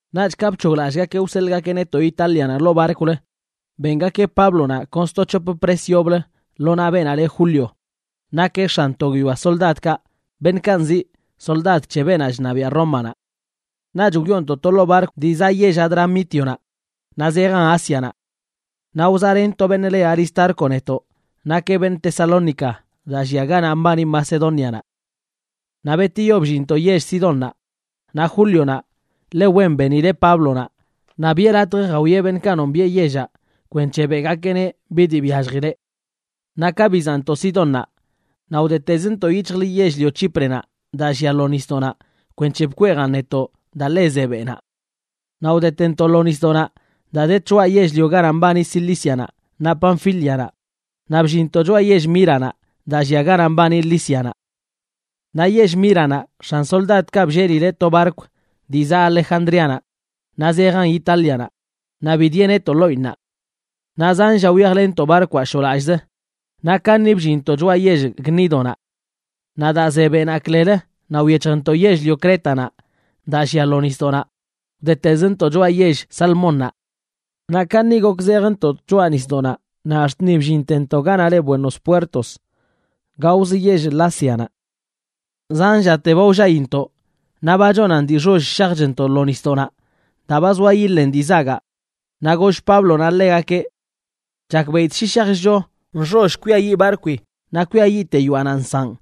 Naꞌch ka bc̱hoglallꞌgakeꞌ wseḻꞌgakeꞌ netoꞌ Itálianaꞌ ḻoo barkwlə, bengakeꞌ Páblonaꞌ kon sto c̱hop pres yoblə lo naꞌ beenaꞌ le Julio, nakeꞌ x̱an to guiyoa soldadkaꞌ beṉꞌkaꞌ nziꞌ soldad c̱he beenaꞌ chṉabiaꞌ Rómanaꞌ. Naꞌch wyoontoꞌ to ḻoo barkw dii zaꞌ yell Adramítionaꞌ naꞌ zejan Ásianaꞌ. Naꞌ wzaꞌlen to beṉꞌ le Aristarco netoꞌ. Nakeꞌ beṉꞌ Tesalónica, daa llia ganaꞌ mbani Macedónianaꞌ. Naꞌ betiyo bllinntoꞌ yell Sidónnaꞌ, naꞌ Júlionaꞌ ḻe wen benileꞌ Páblonaꞌ naꞌ biꞌe latj jawieꞌ beṉꞌkaꞌ nombiꞌe yellaꞌ kwenc̱he beꞌgakeꞌneꞌ bi dii byalljileꞌ. Naꞌ ka bizaꞌntoꞌ Sidonnaꞌ naꞌ wdetezntoꞌ yic̱hjlə yell-lio Chíprenaꞌ daa llia lo nisdoꞌnaꞌ kwenc̱he bkweejan netoꞌ daa ḻe ze beꞌnaꞌ. Naꞌ wdetentoꞌ lo nisdoꞌnaꞌ daa de tchoꞌa yell-lio ganaꞌ mbani Cilícianaꞌ naꞌ Panfílianaꞌ, naꞌ bllinntoꞌ choꞌa yell Míranaꞌ, daa llia ganaꞌ mbani Lícianaꞌ. Naꞌ yell Míranaꞌ x̱an soldadkaꞌ bllelileꞌ to barkw dii zaꞌ Alejandríanaꞌ naꞌ zejan Itálianaꞌ, naꞌ bidieꞌ netoꞌ ḻoꞌinnaꞌ. Naꞌ zan lla wyajlenntoꞌ barkwaꞌ shoꞌlallꞌzə, naꞌ kaṉi bllinntoꞌ choꞌa yell Gnídonaꞌ. Naꞌ daa ze beꞌnaꞌ klelə, naꞌ wyec̱hjntoꞌ yell-lio Crétanaꞌ daa llia lo nisdoꞌnaꞌ, wdetezntoꞌ choꞌa yell Salmónnaꞌ. Naꞌ kaṉi gok zejntoꞌ tchoꞌa nisdoꞌnaꞌ ax̱t ni bllintentoꞌ ganaꞌ le Buenos Puertos, gaozə yell Laseanaꞌ. Zan llate ba wllaintoꞌ naꞌ ba chonan dii nxoll shajchntoꞌ lo nisdoꞌnaꞌ daa ba zoa yiḻen dii zagaꞌ. Naꞌ goll Páblonaꞌ ḻegakeꞌ: ―Chakbeꞌidꞌ shi shajchcho nxoll kwiayiꞌ barkwi naꞌ kwiayiꞌte yoaꞌnaꞌ nsaꞌn,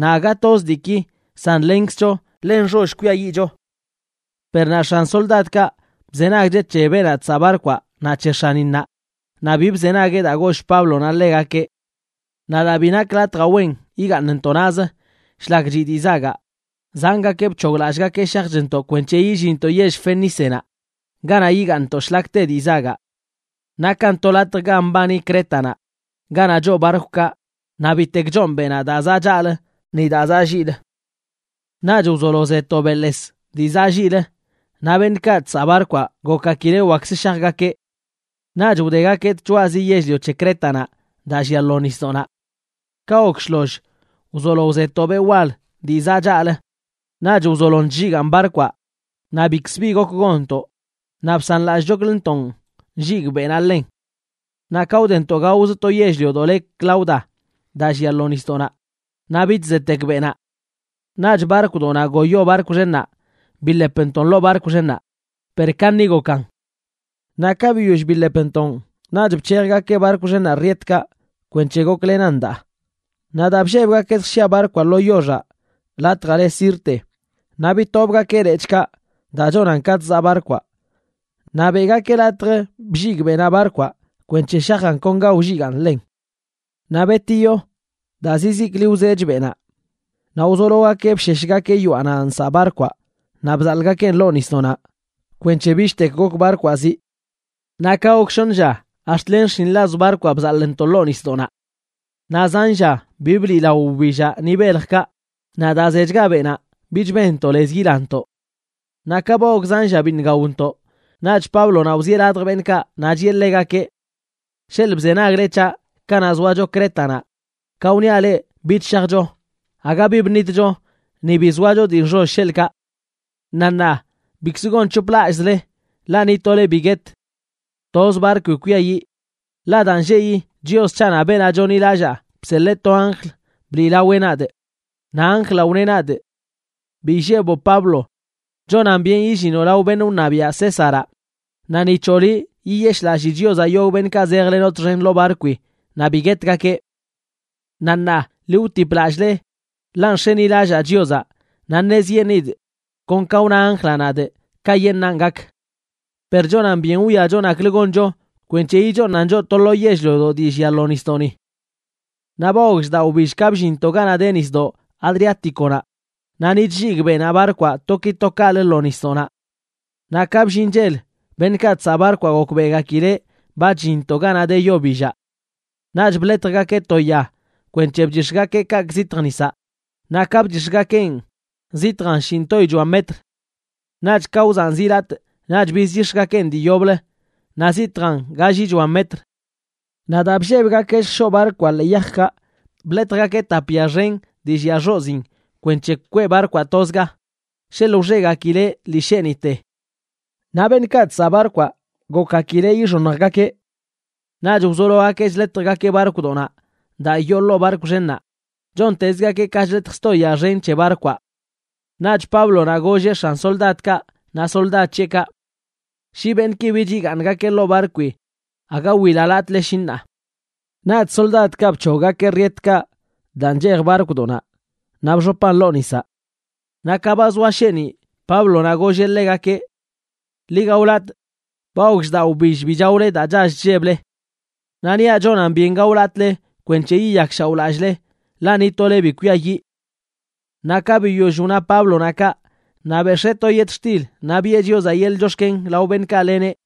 naꞌ aga toz diiki san lenkzcho ḻe nxoll kwiayiꞌcho. Per naꞌ x̱an soldadkaꞌ, bzenagcheꞌ c̱he beenaꞌ chsaꞌ barkwaꞌ naꞌ c̱he x̱aninnaꞌ, naꞌ bi bzenagueꞌ daa goll Páblonaꞌ ḻegakeꞌ. Naꞌ daa bi nak latjaꞌ wen yigaaṉntoꞌ naꞌz shlak chiꞌ dii zagaꞌ, zangakeꞌ bc̱hoglallꞌgakeꞌ shajchntoꞌ kwenc̱he illinntoꞌ yell Fenícenaꞌ ganaꞌ yigaaṉntoꞌ shlak te dii zagaꞌ. Nakan to latj ga mbani Crétanaꞌ, ganaꞌ choo barkwkaꞌ, naꞌ bitek choon beꞌnaꞌ daa zaꞌ chaꞌlə ni daa zaꞌ lliꞌlə. Naꞌch wzolo ze to beꞌḻes dii zaꞌ lliꞌlə, naꞌ beṉꞌkaꞌ chsaꞌ barkwaꞌ gokgakileꞌ wakkzə shajgakeꞌ. Naꞌch wdegakeꞌ tchoꞌazi yell-lio c̱he Crétanaꞌ daa llia lo nisdoꞌnaꞌ. Ka gok shloll, wzolo to beꞌ wal dii zaꞌ chaꞌlə. Naꞌch wzolon chlligaan barkwaꞌ naꞌ bikzə bi gok gonntoꞌ, naꞌ bsanlallꞌchokləntoꞌn nlligꞌ beꞌnaꞌ ḻen. Naꞌ ka wdentoꞌ gaozə to yell-liodoꞌ le Clauda daa llia lo nisdoꞌnaꞌ, naꞌ bich zetek beꞌnaꞌ. Naꞌch barkwdoꞌnaꞌ ngoyo barkw xennaꞌ biḻepntoꞌn ḻoo barkw xennaꞌ, per kaṉi gokan. Naꞌ ka biyoll biḻepntoꞌn, naꞌch bc̱hejgakeꞌ barkw xennaꞌ rietkaꞌ kwenc̱he goklenan daa. Naꞌ daa bllebgakeꞌ lljshia barkwaꞌ lo yoxaꞌ latjaꞌ le Sirte, naꞌ bitobgakeꞌ lechꞌkaꞌ daa chonan ka chzaꞌ barkwaꞌ naꞌ beꞌgakeꞌ latj blligꞌ beꞌnaꞌ barkwaꞌ kwenc̱he shajan kon ga wlligaꞌn ḻen. Naꞌ betiyo, daa zizikli wzech beꞌnaꞌ, naꞌ wzologakeꞌ bsheshgakeꞌ yoaꞌnaꞌ nsaꞌ barkwaꞌ naꞌ bzaḻꞌgakeꞌn ḻoo nisdoꞌnaꞌ kwenc̱he bichtek gok barkwaꞌ zii. Naꞌ ka gok shoṉ lla, ax̱t len xshinḻaz barkwaꞌ bzaḻꞌntoꞌ ḻoo nisdoꞌnaꞌ. Naꞌ zan lla bi bliꞌlao wbillaꞌ ni beljkaꞌ, naꞌ daa zechga beꞌnaꞌ, bich benntoꞌ lez yilantoꞌ. Naꞌ ka ba gok zan lla biṉꞌ gaontoꞌ, naꞌch Páblonaꞌ wzieꞌ ladj beṉꞌkaꞌ naꞌ chiꞌe ḻegakeꞌ: ―Sheḻꞌ bzenagle c̱haꞌ kanaꞌ zoacho Crétanaꞌ, ka wniaꞌ leꞌ bich shajcho, aga bi bṉitcho ni bi zoacho dii nxoll, sheḻꞌkaꞌ. Naꞌ ṉaa bikzə gonc̱hoplallꞌzle, ḻaꞌ ni tole bi guet. Toz barkwi kwiayiꞌ. Ḻaꞌ daa nlleꞌyi Chios c̱haꞌnaꞌ beenaꞌ chonḻilallaa bseḻee to anjl bliꞌlaweꞌ nadꞌ. Naꞌ anjlaꞌ wneꞌ nadꞌ: “Bi illeboꞌ Pablo. Chonan byen illinoꞌ lao beṉꞌ wṉabiaꞌ Césaraꞌ, naꞌ ni c̱hoꞌ liꞌ yiyeshꞌlallii Chiozaꞌ yogꞌ beṉꞌkaꞌ zejlenoꞌ txen ḻoo barkwi naꞌ bi guetgakeꞌ.” Naꞌ ṉaa, ḻi wtiplallꞌle, ḻaꞌ nx̱enilallaa Chiozaꞌ naꞌ ṉezyeṉidꞌ kon ka wna anjlaꞌ nadꞌ kayeṉꞌnan gak. Per chonan byen wwiacho naklə goncho kwenc̱he yichooṉan choꞌ to lo yell-liodoꞌ dii llia lo nisdoꞌni. Naꞌ ba gok shdaꞌ wbill ka bllinntoꞌ ganaꞌ de Nisdoꞌ Adriáticonaꞌ, naꞌ ni chlligꞌ beꞌnaꞌ barkwaꞌ to ki to kaꞌlə lo nisdoꞌnaꞌ. Naꞌ ka bllin chel, beṉꞌkaꞌ chsaꞌ barkwaꞌ gokbeꞌgakileꞌ ba chllinntoꞌ ganaꞌ de yo billaꞌ. Naꞌch bḻetjgakeꞌ to ya kwenc̱he bchix̱gakeꞌ kaꞌkꞌ zitj nisaꞌ, naꞌ ka bchix̱gakeꞌn zitjan shinꞌtoyichoa metr. Naꞌch ka wzaꞌn zilatꞌ naꞌch bizchix̱gakeꞌn dii yoblə naꞌ zitjan gallichoa metr. Naꞌ daa bllebgakeꞌ lljshoꞌ barkwaꞌ ḻee yajkaꞌ, bḻetjgakeꞌ tap ya xen dii llia xoziin kwenc̱he kweꞌ barkwaꞌ tozga, sheḻꞌ wxegakileꞌ lii sheeniꞌte. Naꞌ beṉꞌkaꞌ chsaꞌ barkwaꞌ gokgakileꞌ yixoṉjgakeꞌ. Naꞌch wzologakeꞌ chḻetjgakeꞌ barkwdoꞌnaꞌ daa yoo ḻoo barkw xennaꞌ, chontezgakeꞌ ka chḻetj sto ya xen c̱he barkwaꞌ. Naꞌch Páblonaꞌ golleꞌ x̱an soldadkaꞌ naꞌ soldad c̱heꞌkaꞌ: ―Shi beṉꞌki bich yigaaṉgakeꞌ ḻoo barkwi, aga wilalatꞌle shi ṉaa. Naꞌch soldadkaꞌ bc̱hoggakeꞌ rietkaꞌ daa nchej barkwdoꞌnaꞌ naꞌ bxopan ḻoo nisaꞌ. Naꞌ ka ba zoa sheeniꞌ Páblonaꞌ golleꞌ ḻegakeꞌ: ―Ḻi gaolatꞌ. Ba gok shdaꞌ wbill bi chaole daa chall chlleble. Naꞌ niaꞌ chonan byen gaolatꞌle kwenc̱he yiyakshaoꞌlallꞌle, ḻaꞌ ni tole bi kwiayiꞌ. Naꞌ ka biyoll wna Páblonaꞌ kaꞌ, naꞌ bex̱ee to yetxtil naꞌ biꞌe Chiozaꞌ yeḻꞌ chox̱ken lao beṉꞌkaꞌ leneꞌ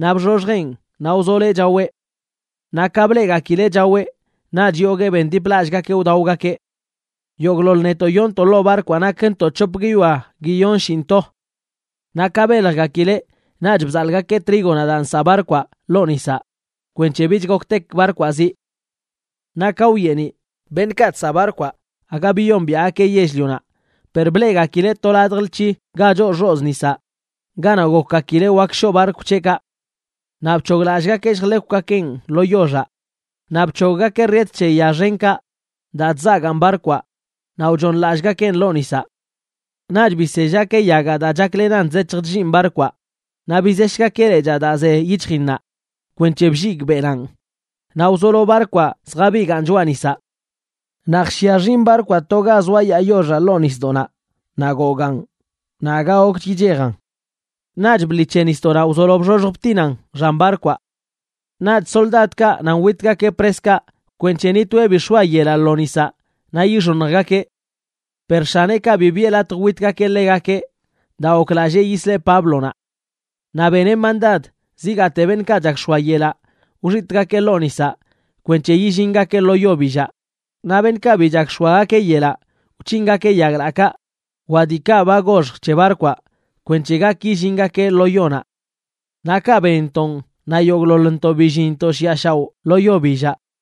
naꞌ bxoxjeꞌn naꞌ wzoloeꞌ chaweꞌ. Naꞌ ka bleꞌgakileꞌ chaweꞌ, naꞌch yoguee bendiplallꞌgakeꞌ wdaogakeꞌ. Yogꞌḻoḻ netoꞌ yoontoꞌ ḻoo barkwaꞌ nakntoꞌ c̱hop guiyoa guiyonshinꞌto. Naꞌ ka beljgakileꞌ, naꞌch bzaḻꞌgakeꞌ trígonaꞌ daa nsaꞌ barkwaꞌ ḻoo nisaꞌ kwenc̱he bich goktek barkwaꞌ zii. Naꞌ ka wyeeniꞌ, beṉꞌkaꞌ chsaꞌ barkwaꞌ aga biyombiaꞌgakeꞌ yell-lionaꞌ, per bleꞌgakileꞌ to ladj lc̱hi ga choo xozꞌ nisaꞌ ganaꞌ gokgakileꞌ wak shoꞌ barkw c̱heꞌkaꞌ. Naꞌ bc̱hoglallꞌgakeꞌ lljḻekwgakeꞌn lo yoxaꞌ. Naꞌ bc̱hoggakeꞌ riet c̱he ya xenkaꞌ daa chzagaan barkwaꞌ naꞌ wchooṉlallꞌgakeꞌn ḻoo nisaꞌ. Naꞌch bisellgakeꞌ yagaꞌ daa chaklenan chzec̱hj chlliin barkwaꞌ, naꞌ bizeshgakeꞌ lechaa daa ze yic̱hjinnaꞌ kwenc̱he blligꞌ beꞌnaꞌn, naꞌ wzolo barkwaꞌ zjabigaan choꞌa nisaꞌ. Naꞌ jshia xinꞌ barkwaꞌ to ga zoayaa yoxaꞌ ḻoo nisdoꞌnaꞌ naꞌ gogaan, naꞌ aga gokch yichejan. Naꞌch bḻi c̱he nisdoꞌnaꞌ wzolon bxoxj btinan xan barkwaꞌ. Naꞌch soldadkaꞌ nan witgakeꞌ preskaꞌ kwenc̱he ni toeꞌ bi x̱oa yelaꞌ lo nisaꞌ naꞌ yixoṉjgakeꞌ. Per x̱aneꞌkaꞌ bi biꞌe latj witgakeꞌ ḻegakeꞌ daa goklallee yisleꞌ Páblonaꞌ. Naꞌ beneꞌ mandad zigaate beṉꞌkaꞌ chak x̱oa yelaꞌ wxitꞌgakeꞌ ḻoo nisaꞌ kwenc̱he yillingakeꞌ lo yo billaꞌ, naꞌ beṉꞌkaꞌ bi chak x̱oagakeꞌ yelaꞌ wc̱hingakeꞌ yaglaꞌkaꞌ wa diikaꞌ ba goxj c̱he barkwaꞌ kwenc̱he gak yillingakeꞌ lo yonaꞌ. Naꞌ kaꞌ benntonꞌ, naꞌ yogꞌḻoḻntoꞌ billinntoꞌ shiꞌa shaoꞌ lo yo billaꞌ.